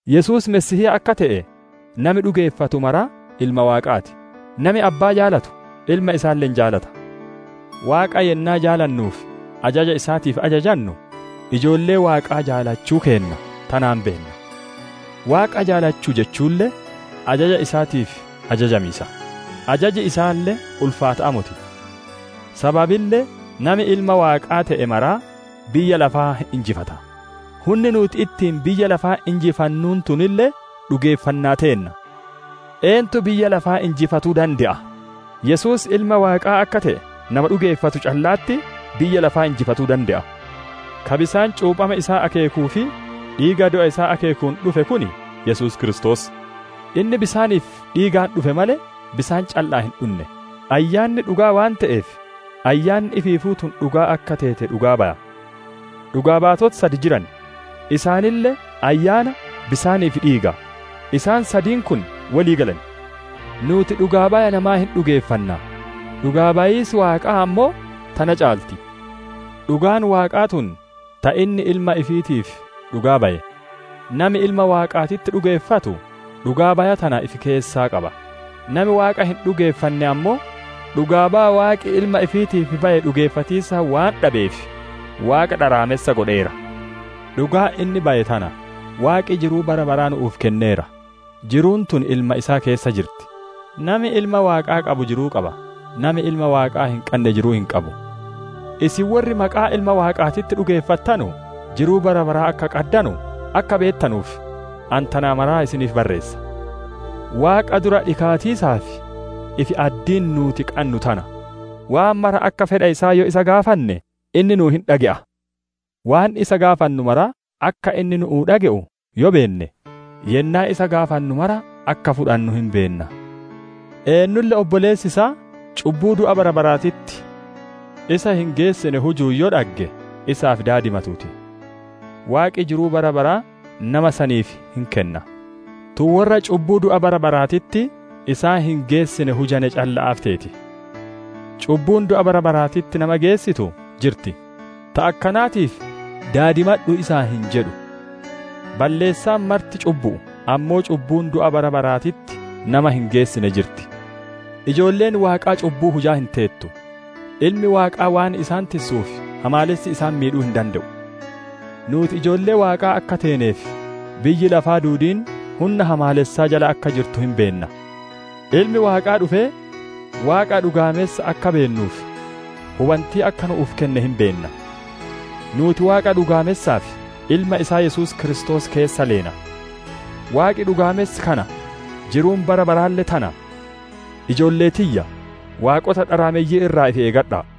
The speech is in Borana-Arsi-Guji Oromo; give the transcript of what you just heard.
Yesuus Masiihii akka te'e nami dhugeeffatu maraa ilma Waaqaa ti; nami Abbaa jaalatu, ilma isaalle hin jaalata. Waaqa yennaa jaalannuu fi ajaja isaatiif ajajannu, ijoollee Waaqaa jaalachuu keenna tanaan beenna. Waaqa jaalachuu jechuulle ajaja isaatiif ajajamiisa; ajaji isaalle ulfaata'aa moti. Sababille nami Ilma Waaqaa te'e maraa biyya lafaa hin injifata. Hunni nuuti ittiin biyya lafaa injifannu tunille, dhugeeffannaa teenna. Eentu biyya lafaa injifatuu dande'a? Yesuus Ilma Waaqaa akka te'e nama dhugeeffatu calla'atti biyya lafaa injifatuu dande'a. Ka bisaan cuuphama isaa akeekuu fi dhiiga du'a isaa akeekuun dhufe kun Yesuus Kiristoos. Inni bisaanii fi dhiigaan dhufe malee, bisaan calla'aan hin dhunne. Ayyaanni dhugaa waan te'eef, Ayyaanni ifiifuu tun dhugaa akka teete dhugaa baya. Dhugaa baatoti sad jiran; isaanille Ayyaana, bisaanii fi dhiiga; isaan sadiin kun wolii galan. Nuuti dhugaa baya namaa hin dhugeeffanna; dhugaa bayiisi Waaqaa ammoo, tana caalti. Dhugaan Waaqaa tun ta inni Ilma ifiitiif dhugaa baye. Nami Ilma Waaqaatitti dhugeeffatu, dhugaa baya tana ifi keessaa qaba; nami Waaqa hin dhugeeffanne ammoo, dhugaa baya Waaqi Ilma ifiitiif baye dhugeeffatiisa waan dhabeef, Waaqa dharaamessa godheera. Dhugaan inni baye tana: Waaqi jiruu bara baraa nu'uuf kenneera, jiruun tun Ilma isaa keessa jirti. Nami Ilma Waaqaa qabu jiruu qaba; nami Ilma Waaqaa hin qanne jiruu hin qabu. Isin worri maqaa Ilma Waaqaatitti dhugeeffattanu, jiruu bara baraa akka qaddanu akka beettanuuf, ani tana mara isiniif barreessa. Waaqa dura dhikaatiisaaf ifi-addiin nuuti qannu tana: waan mara akka fedha isaa yoo isa gaafanne inni nu hin dhage'a. Waan isa gaafannu mara akka inni nu'uu dhage'u yoo beenne, yennaa isa gaafannu mara akka fudhannu hin beenna. Eennulle obboleessi isaa cubbuu du'atti [bara baraatitti] isa hin geessine hujuun yoo dhagge, isaaf daadimatuu ti. Waaqi jiruu bara baraa nama saniif hin kenna. Tun worra cubbuu du'a [bara baraatitti] isaan hin geessine hujane calla'aaf teeti. Cubbuun du'a [bara baraatitti] nama geessittu jirti, ta akkanaatiif daadimadhu isaan hin jedhu. Balleessaan marti cubbu'u; ammoo cubbuun du'a [bara baraatitti] nama hin geessine jirti. Ijoolleen Waaqaa cubbuu hujaa hin teettu; Ilmi Waaqaa waan isaan tissuuf hamaalessi isaan miidhu'uuf hin dande'u. Nuuti ijoollee Waaqaa akka teenee fi biyyi lafaa duudiin hunna hamaalessaa jala akka jirtu hin beenna. Ilmi Waaqaa dhufee Waaqa dhugaamessa akka beennuuf, hubantii akka nu'uuf kenne hin beenna. Nuuti Waaqa dhugaamessaa fi Ilma isaa Yesuus Kiristoos keessa leena. Waaqi dhugaamessi kana, jiruun bara baraalle tana. Ijoollee tiyya, waaqota dharaameyyii irraa ifi eeggadha'a!